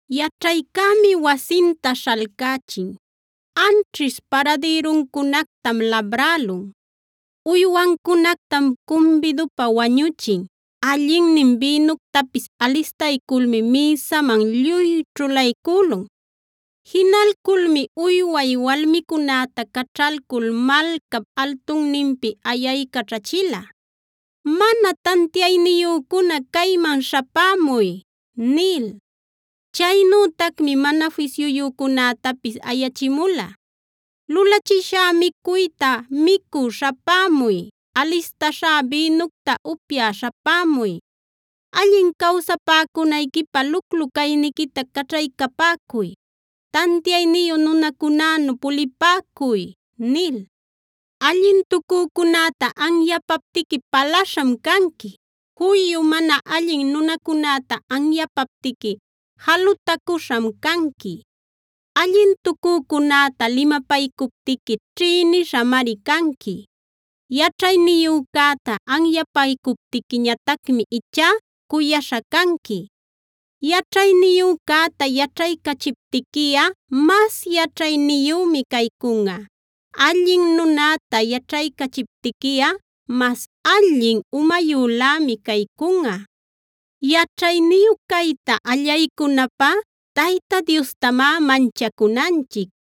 Yaćhaycämi wasinta śhalcächin; anćhish paradïruncunactam labrälun. Uywancunactam cumbidupä wañüchin; allinnin bïnuctapis alistayculmi mïsaman lluy ćhulaycülun. Jinalculmi uyway walmicunäta caćhalcul malcap altunninpi ayaycaćhachila: “Mana tantiayniyücuna cayman śhapämuy” nil. Chaynütacmi mana fisyuyücunätapis ayachimula: “Lulachishá micuyta micü śhapämuy; alistaśhá bïnucta upyä śhapämuy. Allin cawsapäcunayquipä luclu-cayniquita caćhaycapäcuy; tantiayniyu nunacunänu pulipäcuy” nil. Allintucücunäta anyapaptiqui palaśham canqui; juyu mana allin nunacunäta anyapaptiqui jalutacuśham canqui. Allintucücunäta limapaycuptiqui ćhïnishamari canqui. Yaćhayniyücäta anyapaycuptiquiñatacmi ichá cuyaśha canqui. Yaćhayniyücäta yaćhaycachiptiquiꞌa mas yaćhayniyümi caycunꞌa; allin nunäta yaćhaycachiptiquiꞌa mas allin umayülämi caycunꞌa. Yaćhayniyu cayta allaycunapä Tayta Diostamá manchacunanchic;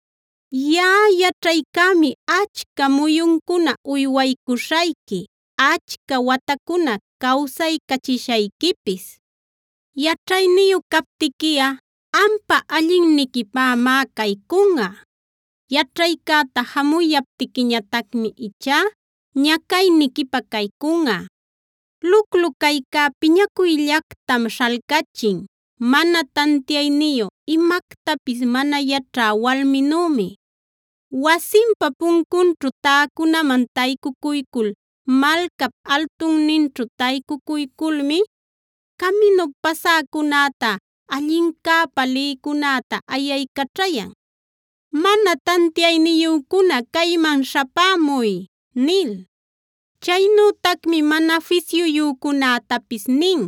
Yaꞌa yaćhaycämi achca muyuncuna uywaycuśhayqui, achca watacuna cawsaycachishayquipis. Yaćhayniyu captiquiꞌa ampa allinniquipämá caycunꞌa; yaćhaycäta jamuyaptiquiñatacmi ichá ñacayniquipä caycunꞌa. Luclu caycá piñacuyllactam śhalcachin; mana tantiayniyu, imactapis mana yaćhä walminümi. Wasinpa puncunćhu täcunaman taycucuycul malcap altunninćhu taycucuyculmi, caminup pasäcunäta, allincäpa lïcunäta ayaycaćhayan: “Mana tantiayniyücuna cayman śhapämuy” nil. Chaynütacmi mana fisyuyücunätapis nin: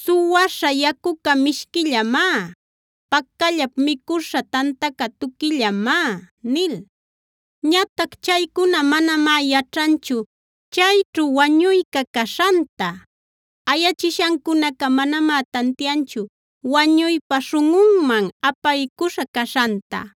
“Suwaśha yacuca mishquillamá; pacallap micuśha tantaca tuquillamá” nil. Ñatac chaycuna manamá yaćhanchu chayćhu wañuyca caśhanta; ayachishancunaca manamá tantianchu wañuypa śhunꞌunman apaycuśha caśhanta.